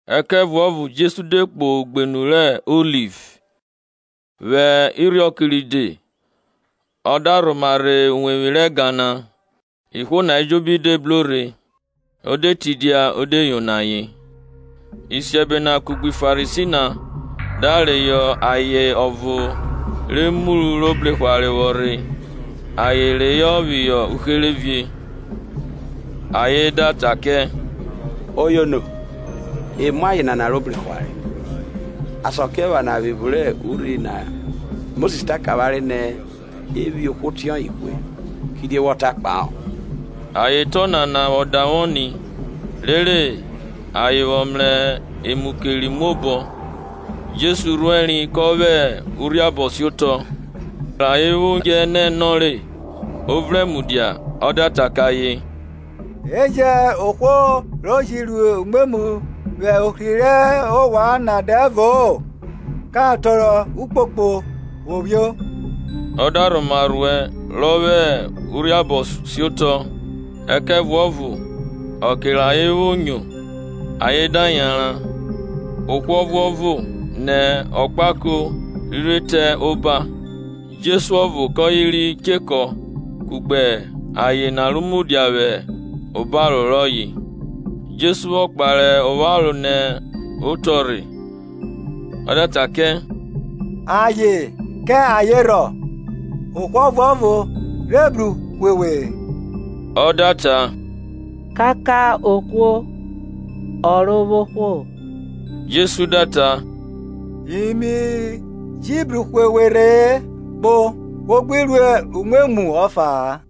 Ẹkẹvuọyo Jesu de kpo ugbenu rẹ Oliv. Vwẹ irhiọke ride ọ da rhoma rhe uwevwi rẹ ẹga na; ihwo na ejobi de bro rhe, o de tidia o de yono ayen. Isiẹbe na kugbe Farisi na da reyọ ayen ọvo re muru ro gbe igberadja bro rhe, ayen da reyọ phihọ uherevie. Ayen da ta kẹ, Oyono, e mu aye nana ro gbe igberadja. Askiephana vwẹ evun rẹ urhi na Mosis ta kẹ avwanre nẹ e phi ohwo ọtiọye hwe. Kidie wọ ta kpahọ? Ayen ta ọnana vwọ davwọ ni, rere ayen vwọ mrẹ emu keri muo obọ. Jesu rhuẹri kọ vwẹ urhiabọ siotọ. Rẹ ayen vwo dje ẹ nọ ẹ nọ re, o vrẹn mudia ọ da ta kẹ ayen, E jẹn ohwo ro ji ru umwemwu vwẹ ohri rẹ ovwan na dẹvo-o ka tọrọ ukpokpo vwo phio. Ọ da rhoma rhuẹ rọ vwẹ urhiabọ vwo siotọ. Ẹkẹvuọvo ọke rẹ ayen vwo nyo, ayen da yanran, ohwo ọvuọvo, nẹ okpako rhiri re te ọkẹ oba, Jesu ọvo kọye ri chekọ kugbe aye na ro mudia vwẹ obaro rọye. Jesu vwọ kpare opharo nẹ otọ rhe ọ da ta kẹ, Aye, kẹ ayen rhọ? Ohwo ọvuọvo rhe bruhwe we-e? Ọ da ta, Kaka ohwo, Ọrovwohwo. Jesu da ta, Yi mi ji bruhwe we rhe-e; kpo, wo gbi ru umwemwu ọfa-a.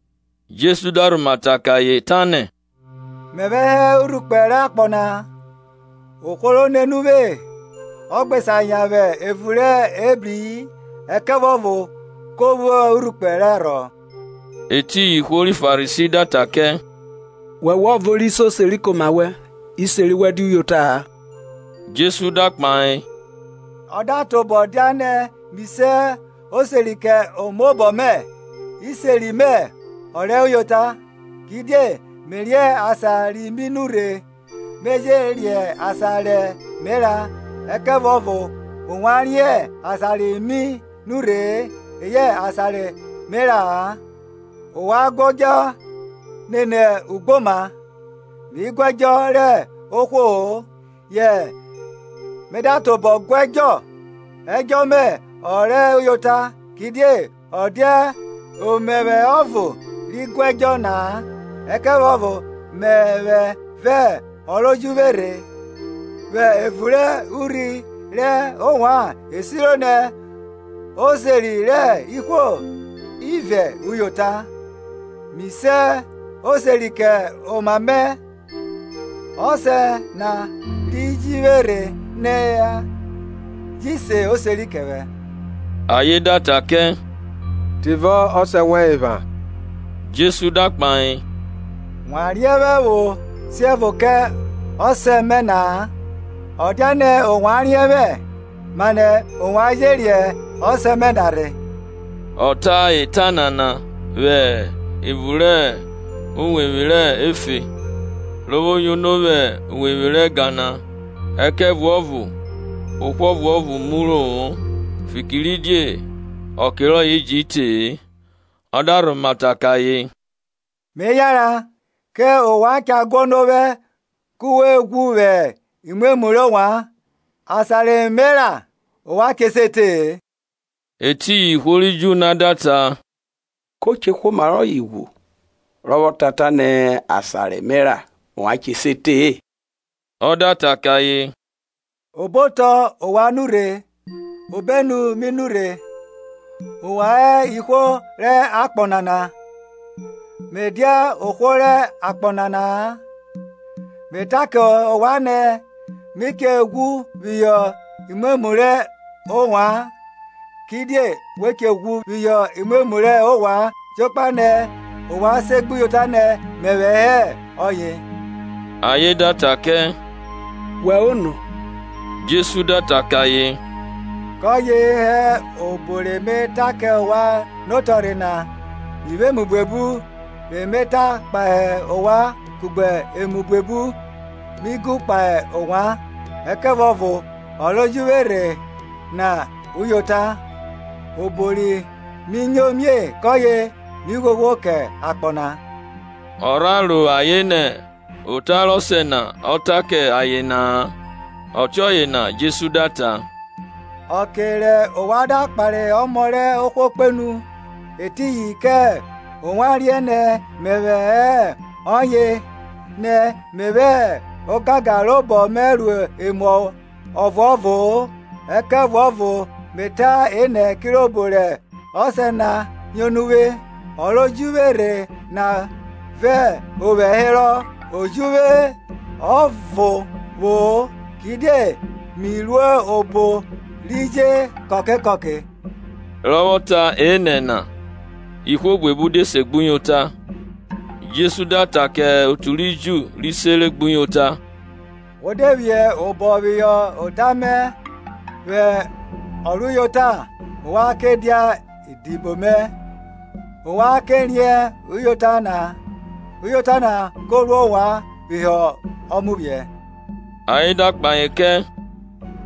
Jesu da rhoma ta kẹ ayen, tanẹ, Mẹvwẹ hẹ urhukpe rẹ akpọ na; ohwo ro nene uvwe ọ gbe sa yan vwẹ evun rẹ ebrii, ẹkẹvuọvo ko vwo urhukpe rẹ arhọ. Etiyin ihwo ri Farisi da ta kẹ, Wọwẹ ọvo ri se oseri kẹ oma wẹn; iseri wẹn dia uyota-a. Jesu da kpahe, Ọ da tobọ dianẹ mi se oseri kẹ omaobọ mẹ, iseri mẹ o rẹ uyota, kidie mẹ riẹn asan ri mi nurhe me je riẹn asan re me ra, ẹkẹvuọvo ovwan riẹn asan ri mi nurhe-e eyẹ asan re me ra-a. Ovwan guẹdjọ nene ugboma, mi guẹdjọ rẹ ohwo-o. Yẹ me da tobọ guẹdjọ, edjọ mẹ ọ rẹ uyota, kidiẹ ọ dia o mẹvwẹ ọvo ri guẹdjọ na-a, ẹkẹvuọvo mẹvwẹ vẹ ọ ro ji vwẹ rhẹ. Vwẹ ẹvun rẹ urhi rẹ ovwan e siro nẹ oseri rẹ ihwo ivẹ uyota; Mi se oseri kẹ oma mẹ, Ọsẹ na ro ji vwe rhe na ji se oseri kẹ vwẹ. Ayen da ta kẹ, Tivọ Ọsẹ wẹn epha? Jesu da kpahe, Wa riẹn vwẹ vwo siẹvo kẹ Ọsẹ mẹ-ẹ; ọ dianẹ ovwan riẹn vwẹ, manẹ ovwan je riẹn Ọsẹ mẹ na rhe. Ọ ta eta nana vwẹ evun rẹ uwevwi rẹ efe, ro vwo yono vwẹ uwevwi rẹ ẹga na; ẹkẹvuọvo ohwo ọvuọvo muro-o, fikiridie ọke rọye ji te-e. Ọ da rhoma ta kẹ ayen, Me yanran, kẹ ovwan cha guọnọ ovwẹ ku we ghwu vwẹ umwemwu rẹ ovwan; asan re me ra, ovwan che se te-e. Etiyin ihwo ri Ju na da ta, Ko che hwe oma rọye, rọ vwọ ta nẹ, Asan re me ra, ovwan che se te-e? Ọ da ta kẹ ayen, obotọ ovwan nurhe, obenu mi nurhe; ovwan hẹ ihwo rẹ akpọ nana, me dia ohwo rẹ akpọ nana-a. Me ta kẹ ovwan nẹ we che ghwu phihọ imwemwu rẹ ovwan, kidie we che ghwu phihọ imwemwu rẹ ovwan jokpa nẹ ovwan segbuyota nẹ mẹvwẹ hẹ ọye. Ayen da ta kẹ, Wẹ ono? Jesu da ta kẹ ayen, kọye hẹ obo re me ta kẹ ovwan notọrhe na. Mi vwo emu buebu re me ta kpahe ovwan kugbe emu buebu mi gu kpahe ovwan; ẹkẹvuọvo ọ ro ji vwe rhe na uyota, obo ri mi nyo mie kọye mi ghwoghwo kẹ akpọ na. Ọ rha ro ayen nẹ ota rẹ Ọsẹ na ọ ta kẹ ayen na-a. Ọtiọye na Jesu da ta, Ọke rẹ ovwan da kpare Ọmọ rẹ ohwo kpenu, etiyin kẹ ovwan riẹn nẹ mẹvwẹ hẹ ọye, nẹ mi vwẹ ogangan robọ mẹ ru emu ọvuọvo-o ẹkẹvuọvo me ta enẹ kirobo rẹ Ọsẹ na yono uvwe. Ọ ro ji vwe rhe na vẹ ovwẹ herọ; o che jẹ uvwe ọvo vwo-o, kidie mi ru obo ri je kọke kọke. Rọ vwọ ta ọnana nu, ihwo buebu de segbuyota. Jesu da ta kẹ otu ri Ju ri sere gbuyota, Wo de phi obọ phihọ ota mẹ vwẹ ọ rẹ uyota ovwan ke dia idibo mẹ, ovwan ke riẹn uyota na, uyota na ko ru ovwan phihọ ọmuvwiẹ. Ayen da kpahe kẹ,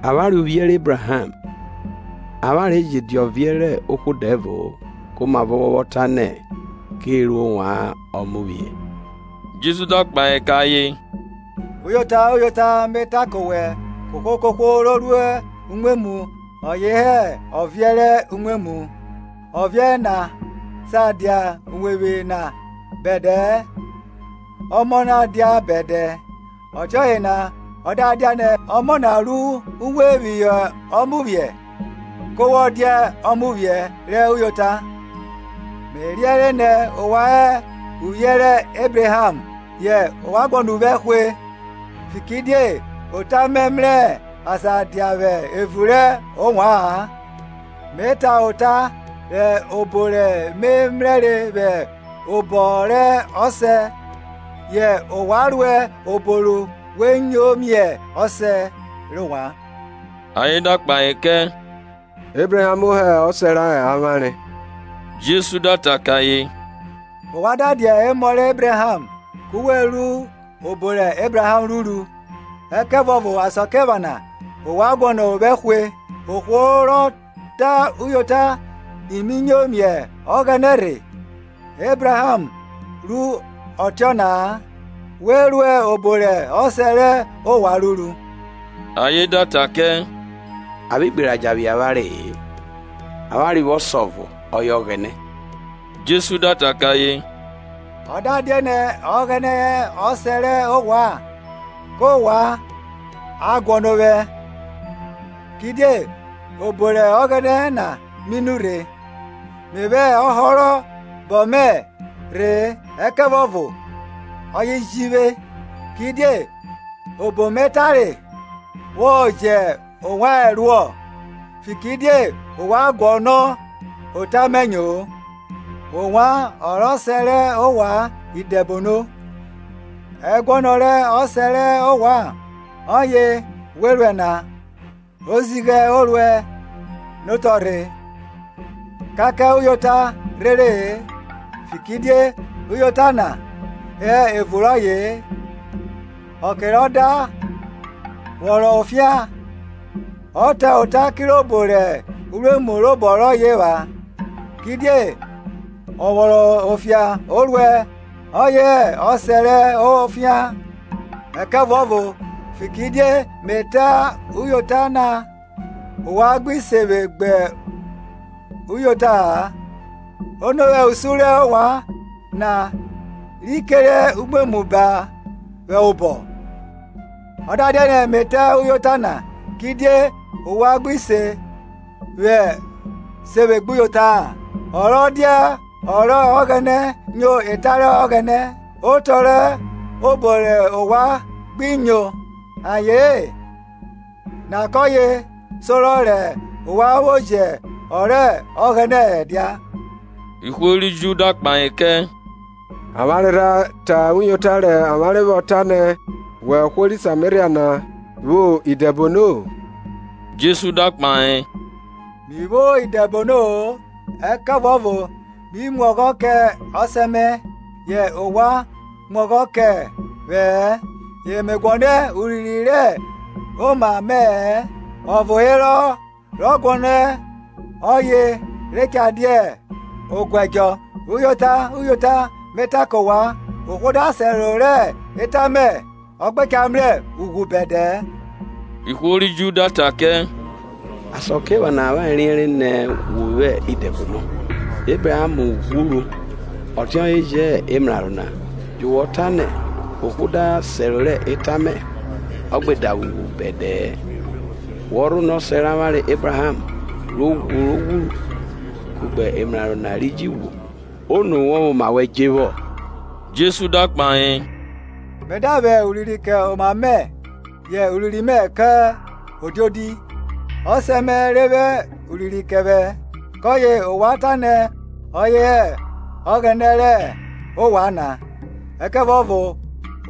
avwanre uvwiẹ rẹ Ebraham, avwanre je dia ọviẹn rẹ ohwo dẹvo-o. Komavọ wọ vwọ ta nẹ, Ke ru ovwan ọmuvwiẹ? Jesu da kpahe kẹ ayen, Uyota, uyota, me ta kẹ ovwan, kohwo kohwo ro ru umwemwu ọye hẹ ọviẹn rẹ umwemwu. Ọviẹn na sa dia uwevwi na bẹdẹ-ẹ; ọmọ na dia bẹdẹ. Ọtiọye na ọ da dianẹ Ọmọ na ru uwe phihọ ọmuvwiẹ, ku wọ dia ọmwuvwiẹ rẹ uyota. Me riẹnre nẹ ovwan hẹ uvwiẹ rẹ Ebraham; yẹ ovwan guọnọ ovwẹ hwe, fikiridie ota mẹ mrẹ asan dia vwẹ evun rẹ ovwa-an. Me ta ota rẹ obo re me mrẹre vwẹ obọ rẹ Ọsẹ mẹ, yẹ ovwan ruẹ obo ru we nyo mie ọsẹ rẹ ovwan. Ayen da kpahe kẹ, Ebraham hẹ ọsẹ rẹ avwanre. Jesu da ta kẹ ayen, Ovwan da dia emọ rẹ Ebraham, ku we ru obo rẹ Ebraham ruru, ẹkẹvuọvo asakiephana ovwan guọnọ ovwẹ hwe, ohwo rọ ta uyota ro nyo miẹ Ọghẹnẹ rhe; Ebraham ru ọtiọna-a. We ruẹ obo rẹ ọsẹ rẹ ovwan ruru. Ayen da ta kẹ, A vwẹ igberadja vwiẹ avwanre-e; avwanre vwo Ọsẹ ọvo, ọye Ọghẹnẹ. Jesu da ta kẹ ayen, Ọ da dianẹ Ọghẹnẹ hẹ Ọsẹ rẹ ovwan, kẹ ovwan a guọnọ ovwẹ, kidie obọ rẹ Ọghẹnẹ na mi nurhe; me vwẹ ọhorobọ mẹ rhe-e, ẹkẹvuọvo ọye ji vwe rhe. Kidie obo mẹ tare vwo jẹ ovwan ẹruọ? Fikiridie ovwan guọnọ ota mẹ nyo-o. Ovwan ọ rẹ ọsẹ rẹ ovwan idẹbono, ẹguọnọ rẹ ọsẹ rẹ ovwan ọye we ruẹ na. Ozighẹ o ruẹ nẹ otọrhe, kaka uyota rhere-e, fikiridie uyota na hẹ evun rọye-e. Ọke rọ da vwọnrọn ofian, ọ ta ota kirobo rẹ uruemu robọ rọye epha, kidie ọ vwọnrọn ofian o ruẹ ọye hẹ ọsẹ rẹ ofian. Ẹkẹvuọvo, fikiridie me ta uyota na, ovwan gbi se vwe gbuyota-a. Ono vwẹ usun rẹ ovwan na ri kere umwemwu ba vwẹ obọ? Ọ da dianẹ me ta uyota na, kidie ovwan gbi se vwe gbuyota-a? Ọ rọ dia ọ rẹ Ọghẹnẹ nyo eta rẹ Ọghẹnẹ; otọ rẹ obo rẹ ovwan gbi nyo aye-en na kọye sorọ rẹ ovwan vwo jẹ ọ rẹ Ọghẹnẹ ẹ dia. Ihwo ri Ju da kpahe kẹ, Avwanre rha ta uyota rẹ avwanre vwọ tanẹ wẹ ohwo ri Sameria nẹ wo vwo idẹbono? Jesu da kpahe, Mi vwo idẹbono-o; ẹkẹvuọvo mi mu ọghọ kẹ Ọsẹ mẹ, yẹ ovwan mu ọghọ kẹ vwẹ-ẹ. Ye me guọnọ urinrin rẹ oma mẹ-ẹ; Ọvo herọ rọ guọnerọ, ọye re cha dia oguẹdjọ. Uyota, uyota, me ta kẹ ovwan, ohwo da sẹro rẹ eta mẹ, ọ gbe cha mrẹ ughwu bẹdẹ-ẹ. Ihwo ri Ju da ta kẹ, Asakiephana avwanre riẹnre nẹ wo vwo idẹbono. Ebraham ghwuru, ọtiọye je hẹ emraro na; yu wọ ta nẹ, Ohwo da sẹro rẹ eta mẹ, ọ gbe davwe ughwu bẹdẹ-ẹ Wọ rhonọ ọsẹ rẹ avwanre Ebraham, ro ghwuru? kugbe emraro na ri ji ghwu! Ono wọ vwẹ oma wẹn dje vwo? Jesu da kpahe, Me da vwẹ urinrin kẹ oma mẹ, yẹ urinrin mẹ kẹ odiodi; Ọsẹ mẹ re vwẹ urinrin kẹ ovwẹ, kọye ovwan tanẹ ọye hẹ Ọghẹnẹ rẹ ovwan na. Ẹkẹvuọvo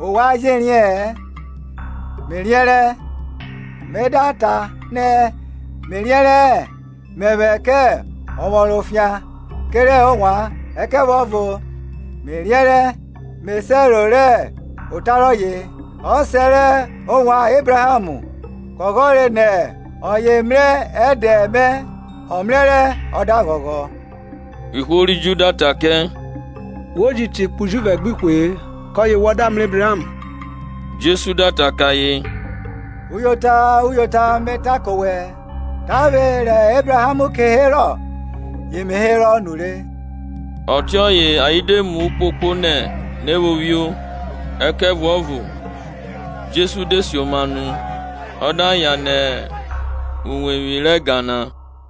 ovwan je riẹ-ẹn; Me riẹnrẹ. Me da ta nẹ, Me riẹnrẹ-ẹ, mẹvwẹ kẹ ọvwọnrọn ofian kerẹ ovwan; ẹkẹvuọvo me riẹnrẹ me sẹro rẹ ota rọye. Ọsẹ rẹ ovwan Ebraham ghọghọre nẹ ọye mrẹ ẹdẹ mẹ; ọ mrẹrẹ ọ da ghọghọ. Ihwo ri Ju da ta kẹ, Wo ji te ikpe ujuvẹ gbẹ ihwe-e, kọye wọ da mrẹ Ebraham? Jesu da ta kẹ ayen, Uyota, uyota, me ta kẹ owẹ, Tavwe rẹ Ebraham ke herọ, ye me herọ nure. Ọtiọye ayen de tọrọ elalọ nẹ ayen vwo phio; ẹkẹvuọvo Jesu de sioma nu, ọ da yan nẹ uwevwi rẹ ẹga na.